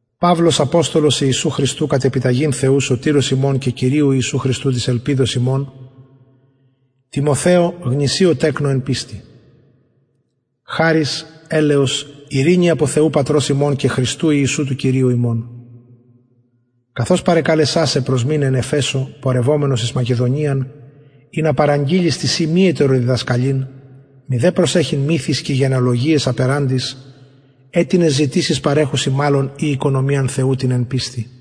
παυλος αποστολος ιησου χριστου κατ επιταγην θεου σωτηρος ημων και κυριου ιησου χριστου της ελπιδος ημων τιμοθεω γνησιω τεκνω εν πιστει χαρις ελεος ειρηνη απο θεου πατρος ημων και χριστου ιησου του κυριου ημων καθως παρεκαλεσα σε προσμειναι εν εφεσω πορευομενος εις μακεδονιαν ινα παραγγειλης τισιν μη ετεροδιδασκαλειν μηδε προσεχειν μυθοις και γενεαλογιαις απεραντοις αιτινες ζητησεις παρεχουσιν μαλλον η οικονομιαν θεου την εν πιστει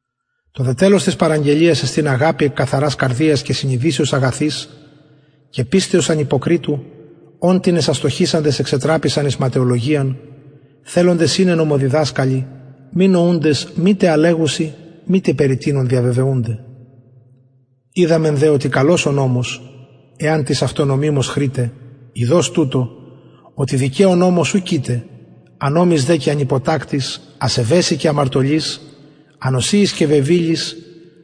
το δε τελος της παραγγελιας εστιν αγαπη εκ καθαρας καρδιας και συνειδησεως αγαθης και πιστεως ανυποκριτου ων τινες αστοχησαντες εξετραπησαν εις ματαιολογιαν θελοντες ειναι νομοδιδασκαλοι μη νοουντες μητε α λεγουσιν μητε περι τινων διαβεβαιουνται οιδαμεν δε οτι καλος ο νομος εαν τις αυτω νομιμως χρηται ειδως τουτο οτι δικαιω νομος ου κειται ανομοις δε και ανυποτακτοις ασεβεσιν και αμαρτωλοις ανοσιοις και βεβηλοις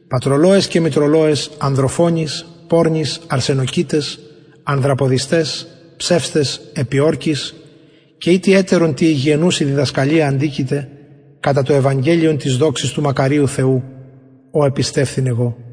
πατρολωαις και μητρολωαις ανδροφονοις πορνοις αρσενοκοιταις ανδραποδισταις ψευσταις επιορκοις και ει τι ετερον τη υγιαινουση διδασκαλια αντικειται κατα το ευαγγελιον της δοξης του μακαριου θεου ο επιστευθην εγω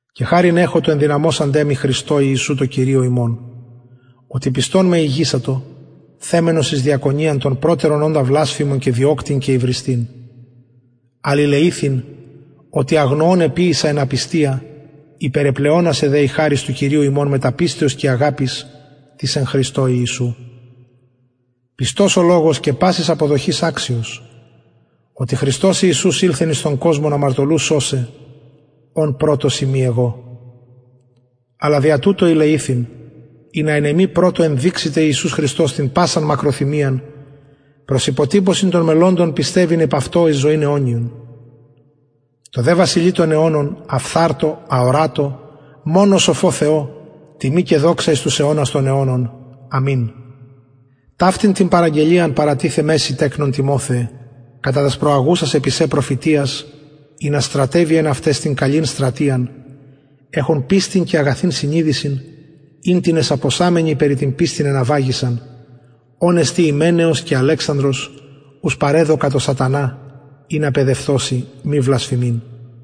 και χαριν εχω τω ενδυναμωσαντι με χριστω ιησου τω κυριω ημων οτι πιστον με ηγησατο θεμενος εις διακονιαν τον προτερον οντα βλασφημον και διωκτην και υβριστην αλλα ηλεηθην οτι αγνοων εποιησα εν απιστια υπερεπλεονασεν δε η χαρις του κυριου ημων μετα πιστεως και αγαπης της εν χριστω ιησου πιστος ο λογος και πασης αποδοχης αξιος οτι χριστος ιησους ηλθεν εις τον κοσμον αμαρτωλους σωσαι ων πρωτος ειμι εγω αλλα δια τουτο ηλεηθην ινα εν εμοι πρωτω ενδειξηται ιησους χριστος την πασαν μακροθυμιαν προς υποτυπωσιν των μελλοντων πιστευειν επ αυτω εις ζωην αιωνιον τω δε βασιλει των αιωνων αφθαρτω αορατω μονω σοφω θεω τιμη και δοξα εις τους αιωνας των αιωνων αμην ταυτην την παραγγελιαν παρατιθεμαι σοι τεκνον τιμοθεε κατα τας προαγουσας επι σε προφητειας ινα στρατευη εν αυταις την καλην στρατειαν εχων πιστιν και αγαθην συνειδησιν ην τινες απωσαμενοι περι την πιστιν εναυαγησαν ων εστιν υμεναιος και αλεξανδρος ους παρεδωκα τω σατανα ινα παιδευθωσιν μη βλασφημειν